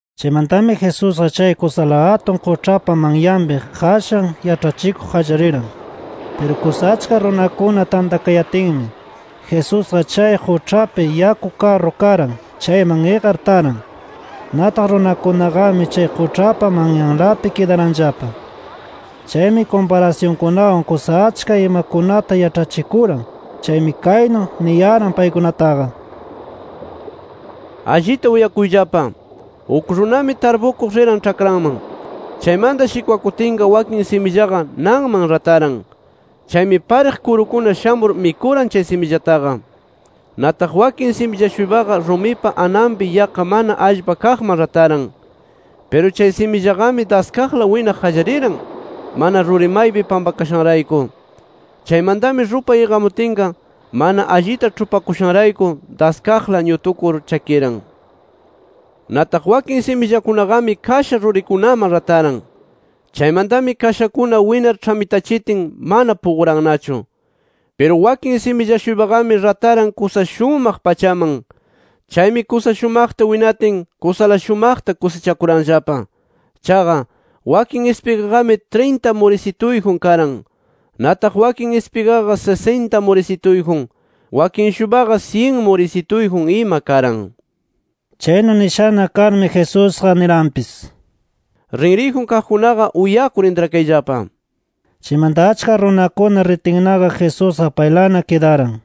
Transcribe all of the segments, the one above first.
Chaymantami Jesusqa chay kusala atun quĉhapa manyanpi qashan yaĉhachikuq qallariran. Piru kusa achka runakuna tantakayatinmi, Jesusqa chay quĉhapi yaku karru karan chayman iqar taran. Nataq runakunaqami chay quĉhapa manyanlapi kidaranllapa. Chaymi kumparasyunkunawan kusa achka imakunata yaĉhachikuran. Chaymi kaynu niyaran paykunataqa: “Allita uyakuyllapa. Uk runami tarpukuq riran ĉhakranman. Chaymanta shikwakutinqa wakin simillaqa nanman rataran. Chaymi pariq kurukuna shamur mikuran chay simillataqa. “Nataq wakin similla-shuypaqa rumipa ananpi yaqqa mana allpa kaqman rataran. Piru chay simillaqami daskaqla winaq qallariran, mana ruri maypi pampakashanrayku. Chaymantami, rupay iqamutinqa mana allita ĉhupakushanrayku, daskaqla ñutukur chakiran. “Nataq wakin simillakunaqami kasha rurikunaman rataran. Chaymantami kashakuna winar ĉhamitachitin, mana puqurannachu. “Piru wakin similla-shuypaqami rataran kusa shumaq pachaman. Chaymi kusa shumaqta winatin, kusala shumaqta kusichakuranllapa. Chaqa, wakin ispigaqami trinta murisituyjun karan. Nataq wakin ispigaqa sisinta murisituyjun. Wakin-shuypaqa, syin murisituyjun ima karan”. Chaynu nishana karmi Jesusqa niranpis: “Rinriyjun kaqkunaqa uyakur intrakayllapa” nir. Chaymanta achka runakuna ritinnaqa Jesusqa paylana kidaran.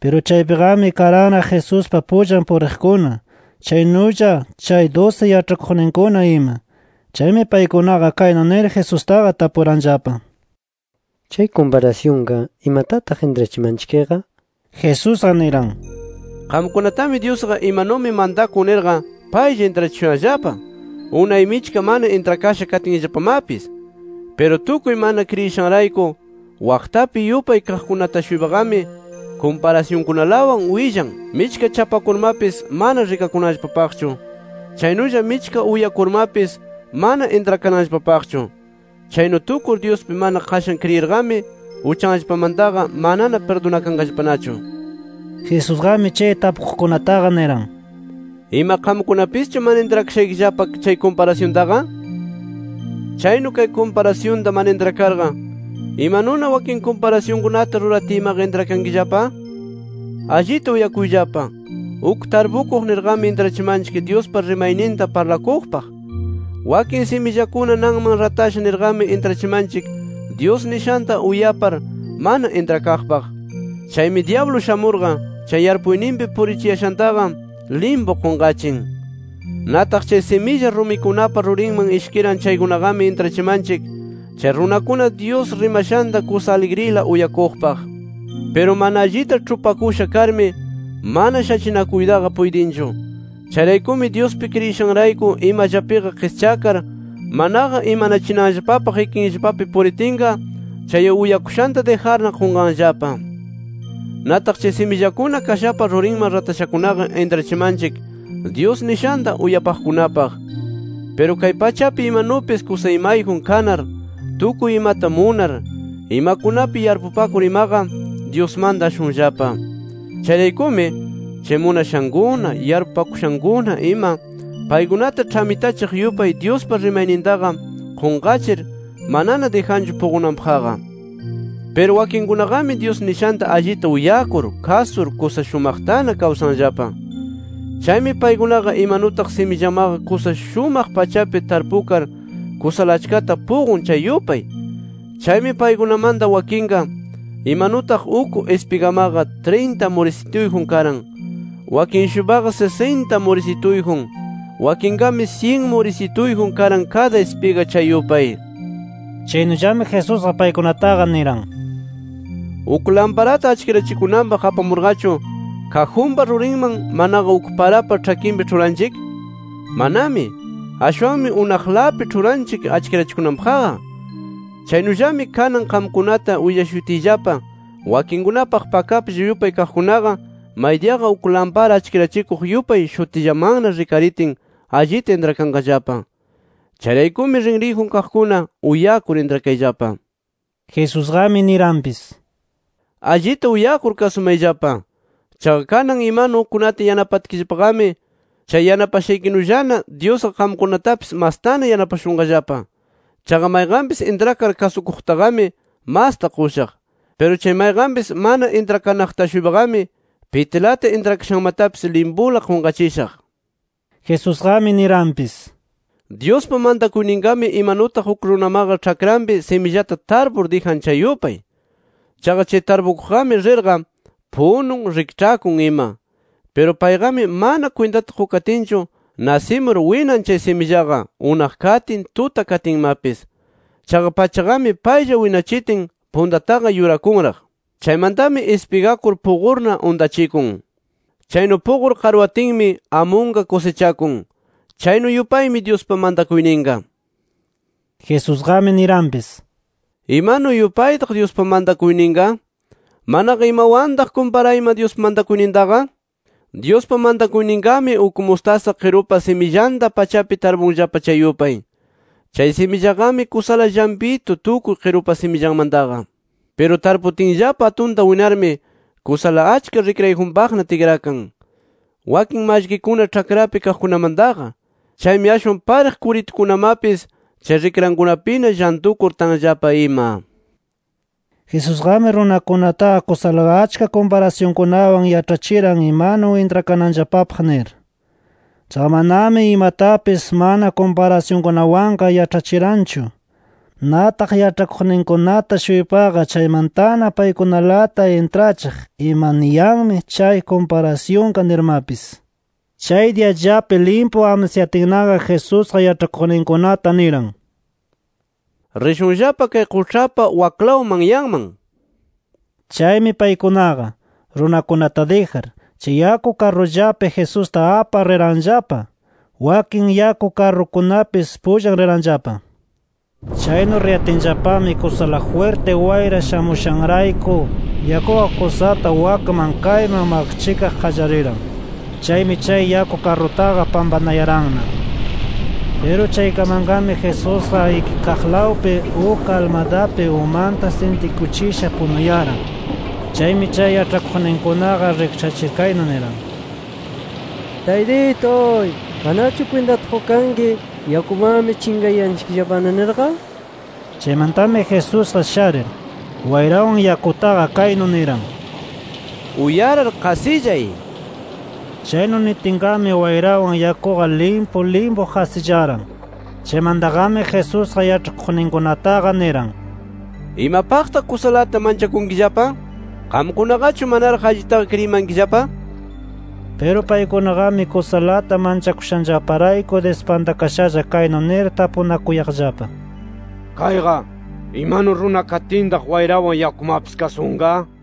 Piru chaypiqami karanraq Jesuspa pullan puriqkuna chaynulla chay dusi yaĉhakuqninkuna ima. Chaymi paykunaqa kaynu nir Jesustaqa tapuranllapa: —Chay kumparasyunqa, ¿imatataq intrachimanchikqa? nir. Jesusqa niran: “Qamkunatami Dyusqa imanumi mantakun nirqa paylla intrachishuyanllapa, unay michka mana intrakasha katinllapamapis. Piru tukuy mana kriyishanrayku waqtapi yupay kaqkunata-shuypaqami kumparasyunkunalawan willan, michka chapakurmapis mana rikananllapapaqchu. Chaynulla michka uyakurmapis mana intrakananllapapaqchu. Chaynu tukur Dyuspi mana qashan kriyirqami, uchanllapamantaqa manana pirdunakanqallapanachu”. Jesusqami chay tapuqkunataqa niran: “¿Ima qamkunapischu mana intrakashaykillapa chay kumparasyuntaqa? Chaynu kay kumparasyunta mana intrakarqa, ¿imanuna wakin kumparasyunkunata ruratiymaqa intrakankillapa? “Allita uyakuyllapa: Uk tarpukuq nirqami intrachimanchik Dyuspa rimayninta parlakuqpaq. Wakin simillakuna nanman ratasha nirqami intrachimanchik Dyus nishanta uyapar mana intrakaqpaq. Chaymi dyablu shamurqa, chay yarpuyninpi purichiyashantaqa limpu qunqachin. “Nataq chay similla rumikunapa rurinman ishkiran chaykunaqami, intrachimanchik chay runakuna Dyus rimashanta kusa aligrila uyakuqpaq. Piru mana allita ĉhupakusha karmi, mana shachinakuytaqa puytinchu. Chayraykumi Dyuspi kriyishanrayku imallapiqa qischakar, manaqa imanachinanllapapaq ikinllapapi puritinqa chay uyakushanta dijarna qunqanllapa. “Nataq chay simillakuna kashapa rurinman ratashakunaqa, intrachimanchik Dyus nishanta uyapaqkunapaq. Piru kay pachapi imanupis kusa imayjun kanar tukuy imata munar, imakunapi yarpupakur imaqa, Dyusmanta ashunllapa. Chayraykumi, chay munashankuna, yarpupakushankuna ima, paykunata ĉhamitachiq yupay Dyuspa rimaynintaqa qunqachir, manana dijanchu puqunanpaqqa. “Piru wakinkunaqami Dyus nishanta allita uyakur kasur kusa shumaqtana kawsanllapa. Chaymi paykunaqa imanutaq simillamaqa kusa shumaq pachapi tarpukar kusala achkata puqun chay yupay. Chaymi paykunamanta wakinqa imanutaq uk ispigamaqa trinta murisituyjun karan, wakin-shuypaqa sisinta murisituyjun, wakinqami syin murisituyjun karan kada ispiga chay yupay”. Chaynullami Jesusqa paykunataqa niran: “Uk lamparata achkirachikunanpaq apamurqachu ¿kajunpa rurinman manaqa uk parapa ĉhakinpi ĉhuranchik? ¡Manami! Ashwanmi unaqlapi ĉhuranchik achkirachikunanpaqqa. Chaynullami kanan qamkunata willashutiyllapa wakinkunapaq pakaplla yupay kaqkunaqa, maydiyaqa uk lampara achkirachikuq yupay shutillamanna rikaritin allita intrakanqallapa. “Chayraykumi, rinriyjun kaqkuna uyakur intrakayllapa”. Jesusqami niranpis: “Allita uyakur kasumayllapa. Chaqa kanan imanu ukkunata yanapatkillapaqami, chay yanapashaykinullana Dyusqa qamkunatapis mastana yanapashunqallapa. Chaqa mayqanpis intrakar kasukuqtaqami masta qushaq. Piru chay mayqanpis mana intrakanaqta-shuypaqami pitilata intrakashanmatapis limpula qunqachishaq” nir. Jesusqami niranpis: “Dyuspa mantakuyninqami imanutaq uk runamaqa ĉhakranpi simillata tarpur dijan chay yupay. Chaqa chay tarpukuqqami rirqa punun, rikĉhakun ima. Piru payqami mana kwintata qukatinchu nasimur winan chay simillaqa unaq katin, tuta katinmapis. Chaqa pachaqami paylla winachitin, puntataqa yurakunraq. Chaymantami ispigakur puqurna untachikun. Chaynu puqur qarwatinmi, amunqa kusichakun. Chaynu yupaymi Dyuspa mantakuyninqa”. Jesusqami niranpis: “¿Imanu yupaytaq Dyuspa mantakuyninqa manaqa imawantaq kumparayman Dyuspa mantakuynintaqa? Dyuspa mantakuyninqami uk mustasa qirupa simillanta pachapi tarpunllapa chay yupay. Chay simillaqami kusala llampitu tukuy qirupa simillanmantaqa. Piru tarputinllapa atunta winarmi, kusala achka rikrayjunpaqna tikrakan, wakin mallkikuna ĉhakrapi kaqkunamantaqa. Chaymi ashwan pariq kuritukunamapis chay rikrankunapina llantukur tanllapa ima”. Jesusqami runakunataqa kusala achka kumparasyunkunawan yaĉhachiran imanu intrakananllapapaq nir. Chaqa manami imatapis mana kumparasyunkunawanqa yaĉhachiranchu. Nataq yaĉhakuqninkunata-shuypaqa chaymantana paykunalata intrachiq ima niyanmi chay kumparasyunqa nirmapis. Chay diyallapi limpu amsayatinnaqa Jesusqa yaĉhakuqninkunata niran: “Rishunllapa kay quĉhapa waklaw manyanman” nir. Chaymi paykunaqa, runakunata dijar, chay yaku karrullapi Jesusta apar riranllapa. Wakin yaku karrukunapis pullan riranllapa. Chaynu riyatinllapami kusala jwirti wayra shamushanrayku yakuqa kusata wakman kayman maqchikaq qallariran. Chaymi chay yaku karrutaqa pampanayaranna. Piru chaykamanqami Jesusqa ikikaqlawpi uk almadapi umanta sintikuchisha punuyaran. Chaymi chay yaĉhakuqninkunaqa rikĉhachir kaynu niran: —¡Taytituy! ¿Manachu kwintata qukanki yakumanmi chinqayanchikllapana nirqa? Chaymantami Jesusqa sharir, wayrawan yakutaqa kaynu niran: —¡Uyarar, qasillay! nir. Chaynu nitinqami wayrawan yakuqa limpu limpu qasillaran. Chaymantaqami Jesusqa yaĉhakuqninkunataqa niran: —¿Imapaqtaq kusalata manchakunkillapa? ¿Qamkunaqachu manaraq allitaqa kriyimankillapa? nir. Piru paykunaqami kusalata manchakushanllaparayku dispantakashalla kaynu nir tapunakuyaqllapa: “¿Kayqa, imanu runa katintaq wayrawan yakumapis kasunqa?” nir.